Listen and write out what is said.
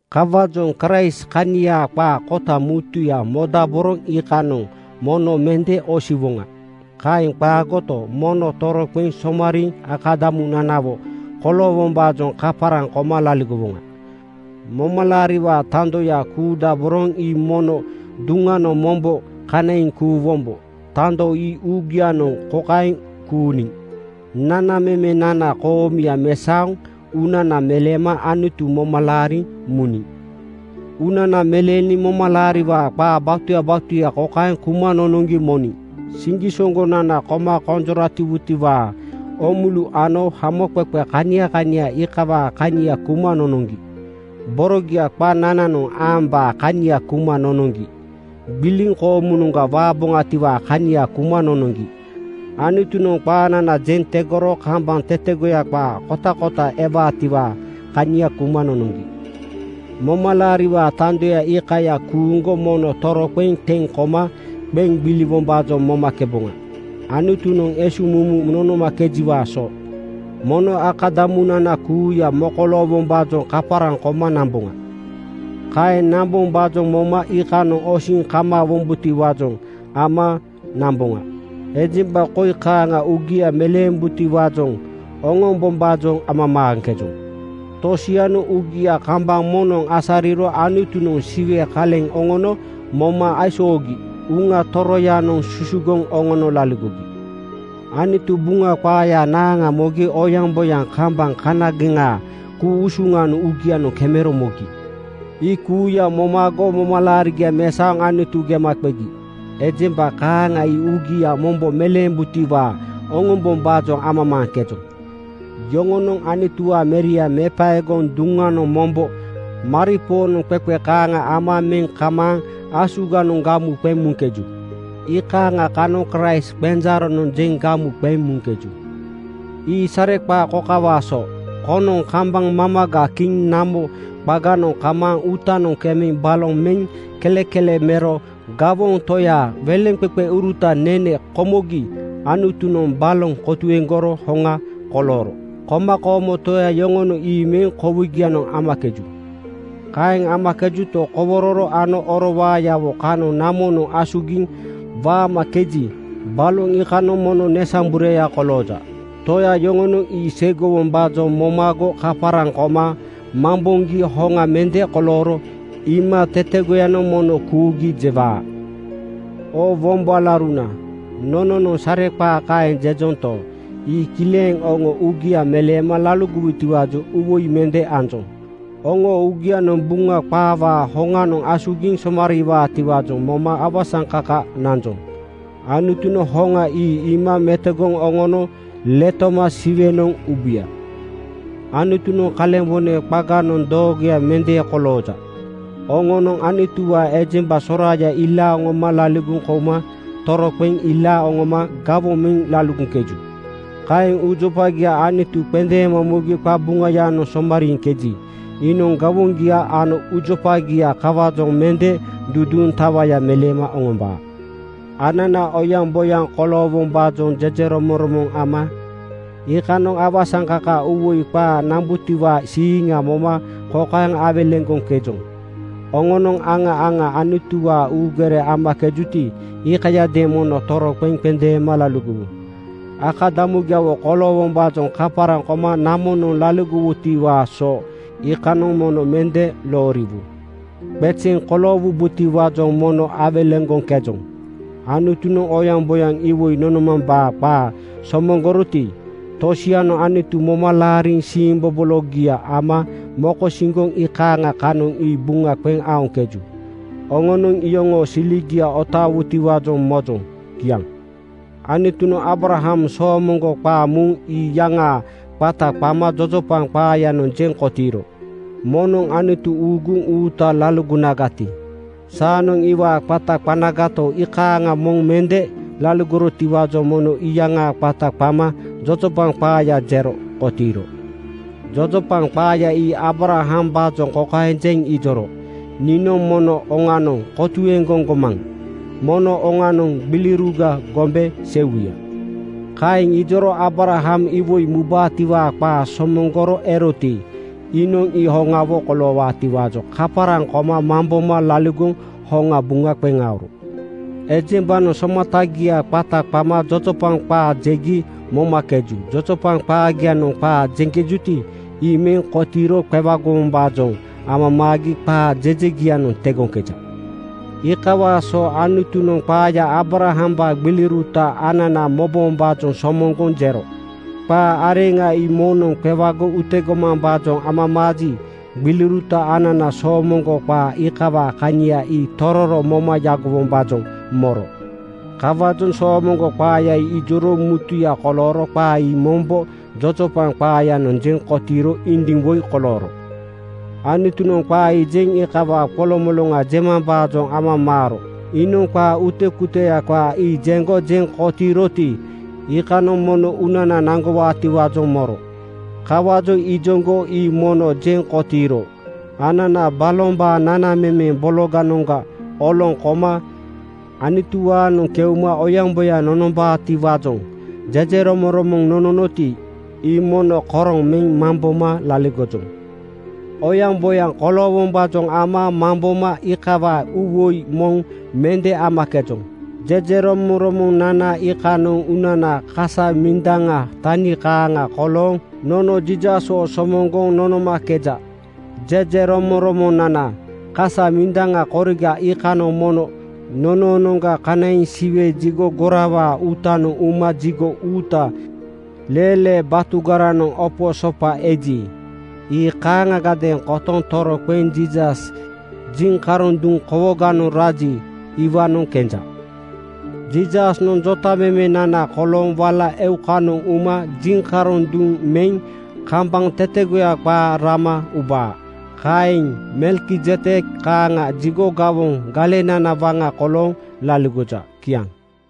Kawaajoŋ Kraist kaniaa qaa kota mutuya modaboroŋ iikanoŋ mono mende osiwoŋa. Kaeŋ qaagoto, mono toroqeŋ somariiŋ akadamunanawo koloowombaajoŋ kaparaŋ koma laligowoŋa. Momalaariwaa tandoya kuudaboroŋ ii mono duŋanoŋ mombo kanaiŋ kuuwombo. Tando ii uugianoŋ kokaeŋ kuuniŋ: Nanamemenana koomuya mesaoŋ uunana meleema Anutu moma laariŋ muniŋ. Uunana meleeniŋ momalaariwaa qaa batuya batuya kokaeŋ kuma nonoŋgi moniŋ: Siŋgisoŋgonana koma konjoratiwutiwaa oomulu ano hamoqeqe kania kania iikawaa kania kuma nonoŋgi. Borogia qanananoŋ aambaa kania kuma nonoŋgi. Gbiliŋ koomunoŋga waaboŋatiwaa kania kuma nonoŋgi. Anutunoŋ qaanana jeŋ tegoro kambaŋ tetegoya qaa kotakota ewaatiwaa kania kuma nonoŋgi. Momalaariwaa tandoya iikaya kuuŋgo mono toroqeŋ teŋ koma qeŋ gbiliwombaajoŋ momakeboŋa. Anutunoŋ esuŋmumu nonomakejiwaa so mono akadamunana kuuya mokoloowombaajoŋ kaparaŋ koma namboŋa. Kaeŋ nambombaajoŋ moma iikanoŋ osiŋ kamaawombotiwaajoŋ ama nanboŋa. Ejemba koi kaaŋa ii uugia meleembutiwaajoŋ oŋombombaajoŋ amamaaŋkejoŋ: Tosianoŋ uugia kambaŋ moŋnoŋ asariro Anutunoŋ Siwe kaleŋa oŋono moma aisoogi Uŋa Toroyanoŋ susugoŋ oŋono laligogi. Anutu Buŋa qaayaa naaŋa mogi oyaŋboyaŋ kambaŋ kanageŋaa ku-usuŋanoŋ uugianoŋ kemero mogi. Ii kuuya momago momalaarigia mesaoŋ Anutu gema qegi. Ejemba kaaŋa ii uugia mombo meleembutiwaa oŋombombaajoŋ amamaaŋkejoŋ. Yoŋonoŋ Anutuwaa Meria mepaegoŋ duŋanoŋ mombo maripoonoŋ qeqe kaaŋa meŋ kamaaŋ ama asuganoŋ gamu qeŋ muŋkeju. Iikaaŋa kanoŋ Kraist qenjaaronoŋ jeŋ gamu qeŋ muŋkeju. Ii sareqaa kokawaa so: Koŋnoŋ kambaŋ mamaga kiŋ namo qaganoŋ kamaaŋ uutanoŋ kemeŋ baloŋ meŋ kelekele mero gawoŋ toyaa weleŋqeqeurutanoŋ nene komogi Anutunoŋ baloŋ kotuegoro hoŋa kolooro komakoomo toya yoŋonoŋ ii meŋ kowigianoŋ amakeju. Kaeŋ amakejuto, kowororo ano oro waayawo kanoŋ namonoŋ asugiŋ waamakeji, baloŋ iikanoŋ mono nesambureya kolooja. Toya yoŋonoŋ ii seigowombaajoŋ momago kaparaŋ koma mamboŋgi hoŋa mende kolooro iima tetegoyanoŋ mono kuugi jewaa. Oo wombo alauruna, nononoŋ sareqaa kaeŋ jejonto, ii kileŋ oŋo uugia meleema laligowutiwaajoŋ uuwoi mende anjoŋ. Oŋoo uugianoŋ Buŋa qaawaa hoŋanoŋ asugiŋ somariiwaatiwaajoŋ moma awasaŋkaka nanjoŋ. Anutunoŋ hoŋa ii iima metogoŋ oŋono letoma Siwenoŋ ubuya. Anutunoŋ kalembone qaganoŋ doogoya mende kolooja. Oŋonoŋ Anutuwaa ejemba soraaya ilaaŋ oŋoma laligoŋ kouma toroqeŋ ilaaŋ oŋoma gawoŋ meŋ laligoŋkeju. Kaeŋ uujopagia Anutu qendeema mugi qabuŋayanoŋ somariiŋkeji, iinoŋ gawoŋgia ano uujopagia kawaajoŋ mende duduuŋ tawaya meleema oŋombaa. Anana oyaŋboyaŋ koloowombaajoŋ jejeromoŋromoŋ ama iikanoŋ awasaŋkaka uuwoi qaa nambutiwaa siiŋnana moma kokaeŋ awelegoŋkejoŋ: Oŋonoŋ aŋa aŋa Anutuwaa uugere amakejuti, iikayadeeŋ mono toroqeŋ qendeema laligowu. Akadamugiawo koloowombaajoŋ kaparaŋ koma namonoŋ laligodaborowutiwaa so iikanoŋ mono mende looriwu. Qezeŋ koloowubotiwaajoŋ mono awelegoŋkejoŋ. Anutunoŋ oyaŋboyaŋ iwoi nonomambaa qaa somoŋgoroti, tosianoŋ Anutu moma laariŋ siimbobologia moma mokosiŋgoŋ iikaaŋa kanoŋ ii buŋa qeŋ aoŋkeju. Oŋonoŋ iyoŋoo siligia otaawutiwaajoŋ mojoŋ. Kiaŋ. Anutunoŋ Aabraham soomoŋgo qaa muŋ ii iyaŋaa qata qama jojopaŋ qaayanoŋ jeŋ kotiiro. Moŋnoŋ Anutu uuguŋ uuta laligonagati, saanoŋ iwaa qata qanagato, iikaaŋa moŋ mende laligorotiwaajoŋ mono iyaŋaa qata qama jojopaŋ qaaya jero kotiiro. Jojopaŋ qaaya ii Aabrahambaajoŋ kokaeŋ jeŋ ijoro, “Niinoŋ mono oŋanoŋ kotuegoŋ gomaŋa. Mono oŋanoŋ gbiliuruga gombe seiwuya.” Kaeŋ ijoro Aabraham iwoi mubaatiwaa qaa somoŋgoro eroti, iinoŋ ii hoŋawo koloowaatiwaajoŋ kaparaŋ koma mamboma laligoŋ hoŋa buŋa qeŋ aoro. Ejembanoŋ somatagiaa qata qama jojopaŋ qaa jegi momakeju. Jojopaŋ qaagianoŋ qaa jejuti, ii meŋ kotiiro qewagowombaajoŋ amamaagi qaa jejegianoŋ tegoja. Iikawaa so Anutunoŋ qaaya Aabrahambaa gbiliuruta anana mobombaajoŋ somoŋgoŋ jero. Qaa areŋa ii moŋnoŋ qewagoŋ utegomambaajoŋ amamaaji, gbiliuruta anana soomoŋgo qaa iikawaa kania ii tororo moma yagowombaajoŋ moro. Kawaajoŋ soomoŋgo qaaya ijoro mutuya kolooro qaa ii mombo jojopaŋ qaayanoŋ jeŋ kotiiro indiŋ woi kolooro. Anutunoŋ qaa ii jeŋ iikawaa qolomoloŋa jemambaajoŋ amamaaro. Iinoŋ qaa utekuteya qaa ii jeŋgo jeŋ kotiiroti, iikanoŋ mono uunana naŋgowaatiwaajoŋ moro. Kawaajoŋ ijoŋgo ii mono jeŋ kotiiro. Anana balombaa nanamemeŋ bologanoŋga oloŋ koma Anutuwaanoŋ keuma oyaŋboyaŋ nonombaatiwaajoŋ jejeromoŋromoŋ nononoti, ii mono koroŋ meŋ mamboma laligojoŋ. Oyaŋboyaŋ koloowombaajoŋ ama mamboma iikawaa uuwoi moŋ mende amakejoŋ. Jejeromoŋromonana iikanoŋ uunanaa kasa mindaŋa tani kaaŋa kolooŋ nono Jiisaswo somoŋgoŋ nonomakeja. Jejeromoŋromonanaa kasa mindaŋa koriga iikanoŋ mono nonoonoŋga kanaiŋ Siwe jigo gorawaa uutanoŋ uma jigo uuta leelee batugaranoŋ opo sopa eji, ii kaaŋagadeeŋ kotoŋ toroqeŋ Jiisas jiŋkaroŋ duŋ kowoganoŋ raji, iwaanoŋ kenja. Jiisasnoŋ jotamemenana kolooŋ wala eukanoŋ uma jiŋkaroŋ duŋa meŋ kambaŋ tetegoya qaa rama ubaa. Kaeŋ Melkizedek kaaŋa jigo gawoŋ galenana waŋa kolooŋ laligoja. Kiaŋ.